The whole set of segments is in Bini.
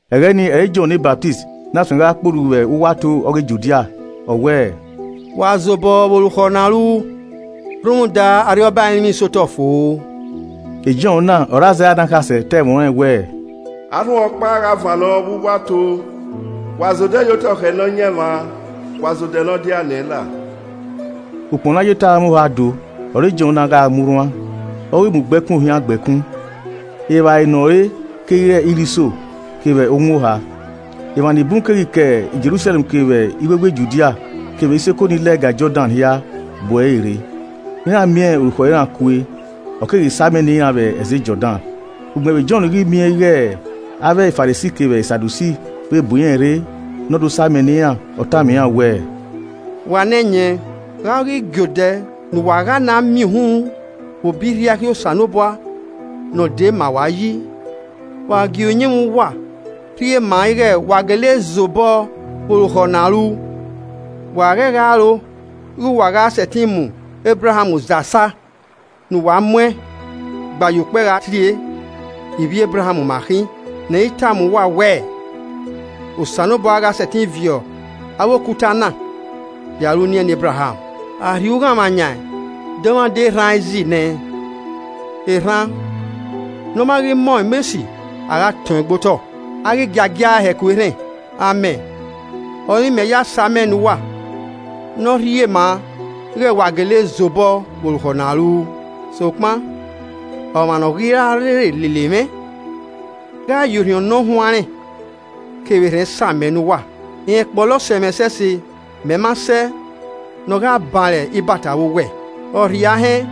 Ẹghẹ ni ọre Jọn ne Ọsamẹ na suẹn gha kporhu vbe uwu ato ọghe Judia, ọ wẹẹ, “Wa zobọ vbe orukhọ ne a ru rhunmwuda Arriọba ẹrinmwi sotọ fo.” E Jọn na ọre Aizaia ne akhasẹ ta ẹmwẹ ọnrẹn wẹẹ, “Arhunmwu ọkpa gha vannọ vbe uwu ato: Wa zodẹ yotọ khẹ Nọyaẹnmwa, wa zodẹ ne ọ diae nẹẹn la.” Ukpọn ne a ye eto aranmwẹ oha do ọre Jọn na gha mu rhuan, ọ ghi mu ugbẹkun ohian gba ẹkun, evbare ne ọ re keghi re irhiso kevbe owọn oha. Emwa nibun keghi ke Jerusalẹm kevbe iwewe Judia kevbe isoko ni lẹga Jọdan hia bu ẹre rre. Iran miẹn Orukhọ iran kue. Ọ keghi samẹ ne iran vbe ẹzẹ Jọdan. Ugbẹn vbe Jọn ghi miẹn ighe avbe Farisi kevbe e Sadusi vẹ bu irẹn rre ne ọ do samẹ ne iran, ọ tama iran wẹẹ, “Wa ne ẹyẹn, gha ọ ghi giodẹ ne uwa gha na miẹn uhunmwu vbe obọ irriaikhi Osanobua ne ọ dee ma uwa yi? Wa gie uyinmwẹ uwa rhie ma ighe wa gele zobọ vbe orukhọ ne a ru. Wa ghẹ gha roro ighe uwa gha sẹtin mu Ebraham zasa ne uwa muẹn gba ye ukpẹ gha tie, ‘Ivbi Ebraham ma khin.’ Ne I tama uwa wẹ Osanobua gha sẹtin viọ vbe avbe okuta na ya ru uniẹn ne Ebraham. A rhie ughanmwa yan dọmwadẹ erhan ẹzi nẹ, erhan ne ọ ma ghi mọ ọmọ esi, a gha tọn ẹn gbe otọ, a ghi giagia ẹe hẹku erhẹn. Amẹ ọre imẹ ya samẹ ne uwa ne ọ rhie ma ighe wa gele zobọ vbe orukhọ ne a ru. Sokpan ọmwa ne ọ ghi ra rre lele mwẹ gha ya Orhiọn Ne Ọ Huanrẹn kevbe erhẹn samẹ ne uwa. Rẹn kpọlọ sẹ mwẹ ẹsẹse, mẹ ma sẹ ne ọ gha ban ẹre ibata vbe owẹ. Ọ rhie ahẹn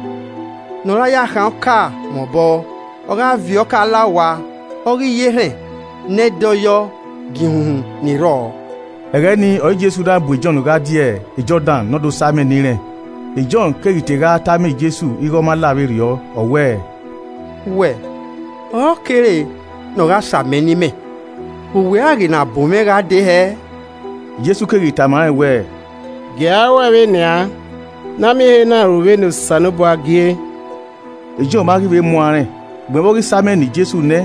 ne ọ ra ya khan ọka mwẹ obọ, ọ gha viọ ọka la owa, ọ ghi ya erhẹn ne ẹ i dọyọ giẹn ihunhun ni rrọọ.” Ẹghẹ ni ọre Jesu na bu Jọn gha die Jọdan ne ọ do samẹn ne irẹn. E Jọn keghi te gha tama Jesu ighe ọ ma la vberriọ, ọ wẹẹ, “Wẹ ọre ọ kere ne ọ gha samẹn ne imẹ, vbe uwẹ ghi na bu mwẹ gha dee hẹẹ?” Jesu keghi tama rẹn wẹẹ, “Gie a ruẹe vbenian, ne a miẹn ehe na ru vbene Osanobua gie.” E Jọn ma ghi vbe muan rẹn. Ugbẹn vbe a ghi samẹn ne Jesu nẹ,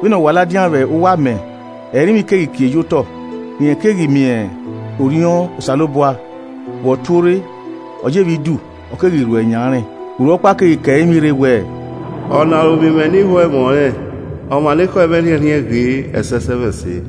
vbene ọ wa ladian vbe uwu amẹ, ẹrinmwi keghi kie ye otọ, rẹn keghi miẹn Orhiọn Osanobua vbe ọ tuorre, ọ yevbe idu, ọ keghi rhuẹ yan rẹn. Urhu ọkpa keghi ke ẹrinmwi rre wẹẹ, “Ọna ọre ovbi mwẹ ni ho ẹmwẹ ọnrẹn, ọmwa ne ekhọe mwẹ rhiẹnrhiẹn ghe ẹsẹsẹmwẹse.”